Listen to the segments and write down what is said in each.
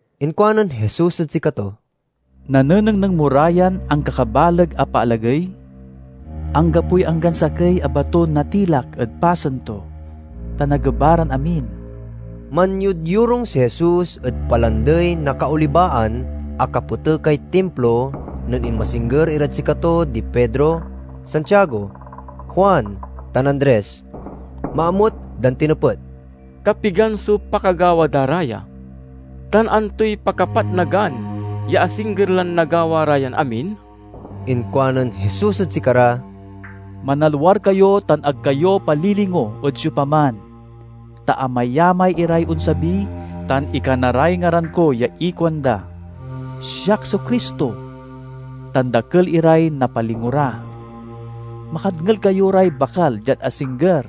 Inkuanen Jesus ed sikato, "Nanenengneng mo ra yan ankakabaleg a paalagey? Anggapoy anggan sakey a baton natilak ed pasen to, ta nageba ran amin." Manyodyorung si Jesus ed Palandey na Kaolibaan a kapetekay Timplo nen inmasingger irad sikato di Pedro, Santiago, Juan, tan Andres. Maamut dan tinepet, "Kapigan so pakagawa da ra ya, tan antoy pakapatnagan ya asingger lan nagawa ra yan amin?" Inkuanen Jesus ed sikara, "Manalwar kayo tan ag kayo palilingo ed siopaman. Ta amayamay iray onsabi tan ikana ray ngaran ko ya ikuanda, 'Siak so Cristo!' tan dakel iray napalingo ra. Makadngel kayo ray bakal diad asingger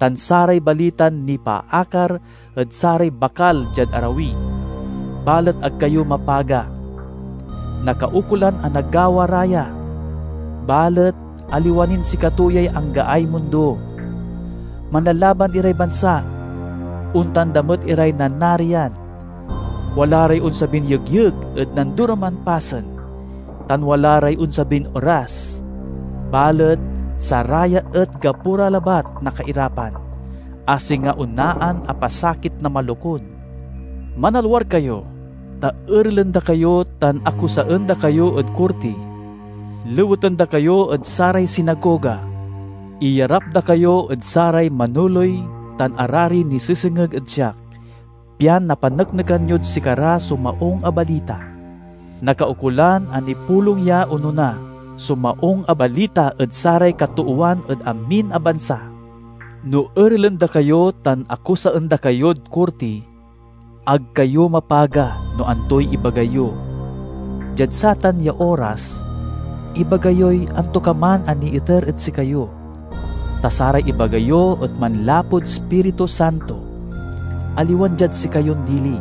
tan saray balitan nipaakar ed saray bakal diad arawi, balet ag kayo mapaga. Nakaukolan a nagawa ra ya, balet aliwa nin sikato yay anggaay mundo. Manlalaban iray bansa; ontan da met iray nanarian. Wala ray onsabin yegyeg ed nandoroman pasen, tan wala ray onsabin eras. Balet saraya et gapo ra labat na kairapan, a singa onaan a pasakit na malokun. "Manalwar kayo! Ta erelen da kayo tan akusaen da kayo ed korti. Leweten da kayo ed saray sinagoga; iyarap da kayo ed saray manoley tan arari nisesengeg ed siak, pian napaneknekan yod sikara so Maung a Balita. Nakaukolan a nipulong ya onona so Maung a Balita ed saray katoowan ed amin a bansa. No erelen da kayo tan akusaen da kayod korti, ag kayo mapaga no antoy ibaga yo. Diad satan ya oras, ibaga yoy antokaman a niiter ed sikayo. Ta saray ibaga yo et manlapud Ispiritu Santo, aliwan diad sikayon dili.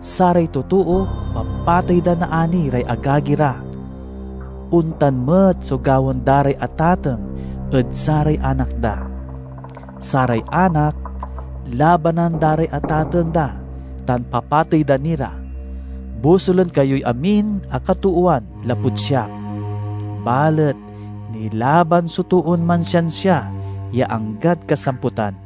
Saray totoo papatey da naani ray agagi ra. Ontan met so gawaen da ray atateng ed saray anak da. Saray anak labanan da ray atateng da tan papatey da ni ra. Bosulen kayoy amin a katoowan lapud siak. Balet nilaban so toon mansiansia ya anggad kasamputan."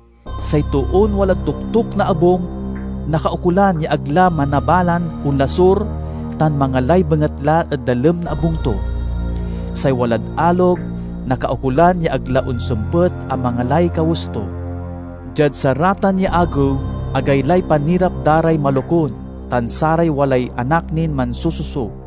Say toon walad toktok na abung nakaukolan ya ag la manabalan onlasur tan mangalay bengatla ed dalem na abung to. Say walad alog nakaukolan ya ag la onsempet a mangalay kawes to. Diad saratan ya agew, agaylay panirap da ray malokun tan saray walay anak nin mansususo!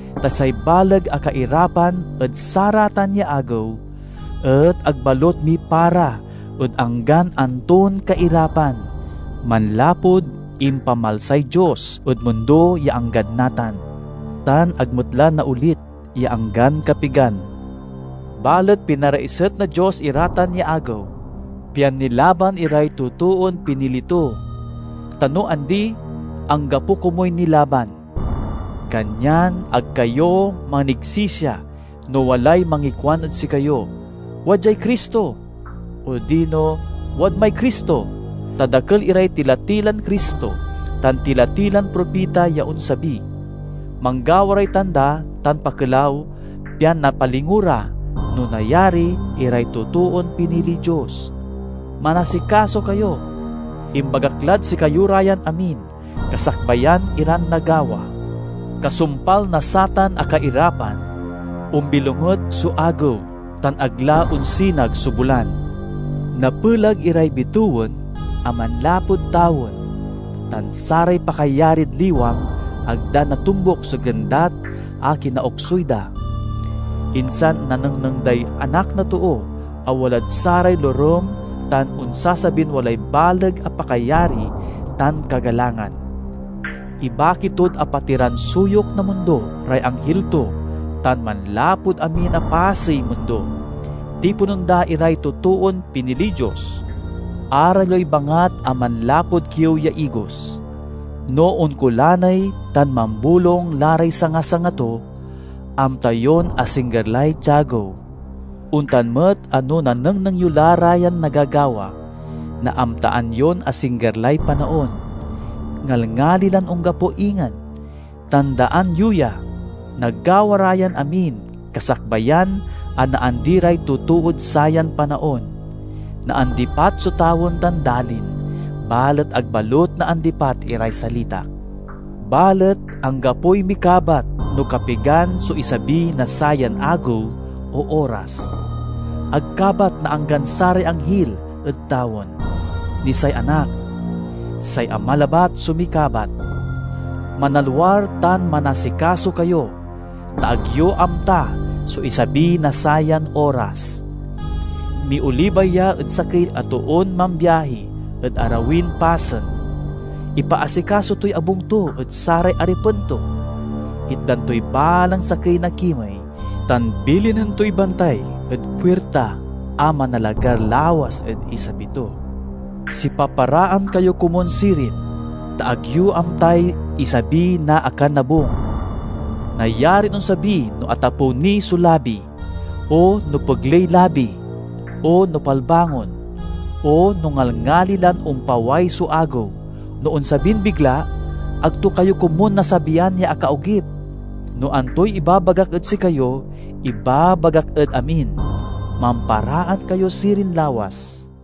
Ta say baleg a kairapan ed saratan ya agew et ag balut mipara ed anggan anton kairapan, manlapud impamalsay Dios ed mundo ya anggad natan, tan ag met la naolit ya anggan kapigan. Balet pinaraiset na Dios ira tan ya agew, pian nilaban iray totoon pinili to; ta no andi, anggapo komuy nilaban. "Kanyan ag kayo manigsisia no walay mangikuan ed sikayo, 'Wadyay Cristo!' odino, 'Wadmay Cristo!' Ta dakel iray tila-tilan Cristo tan tila-tilan propita ya onsabi. Manggawa ray tanda tan pakelaw pian napalingo ra, no nayari, iray totoon piniliy Dios. Manasikaso kayo! Imbagak lad sikayo ra yan amin kasakbayan iran nagawa." "Kasumpal na satan a kairapan, ombilonget so agew tan ag la onsinag so bulan. Napelag iray bitewen a manlapud tawen, tan saray pakayarid liwang ag da natombuk so gendat a kinaoksuy da. Insan nanengneng day Anak na Too a walad saray lorem tan onsasabin walay baleg a pakayari tan kagalangan. Ibaki tod apatiran suyok na mundo ray anghil to tan, manlapud amin a pasey mundo, tiponen da iray totoon piniliy Dios." "Aral yoy bangat a manlapud kiew ya igos. No onkolaney tan mambolung la ray sanga-sanga to, amta yon asingger lay tiagew. Ontan met a no nanengneng yo la ra yan nagagawa, naamtaan yon asingger lay panaon. Ngalngali lan onggapo ingen. Tandaan yo ya! Nagawa ra yan amin kasakbayan a naandi ray totood sayan panaon. Naandipat so tawen tan dalin, balet ag balut naandipat iray salitak." "Balet anggapoy mikabat no kapigan so isabi na sayan agew o oras. Ag kabat na anggan saray anghil ed tawen, ni say Anak. Say Ama labat so mikabat. Manalwar tan manasikaso kayo, ta ag yo amta so isabi na sayan oras. Miolibay ya ed sakey a toon mambiahi ed arawin pasen. Ipaasikaso toy abung to ed saray aripen to. Itdan toy balang sakey na kimey tan bilinen toy bantay ed puirta a manalagar lawas ed isabi to. Sipaparaan kayo komun sirin, ta ag yo amtay isabi na akanabung. Nayarin onsabi no atapew ni so labi, o no pegley labi, o no palbangon, o no ngalngali lan ompaway so agew. No onsabin bigla, ag to kayo komun nasabian ya akaogip. No antoy ibabagak ed sikayo, ibabagak ed amin: Mamparaan kayo sirin lawas!"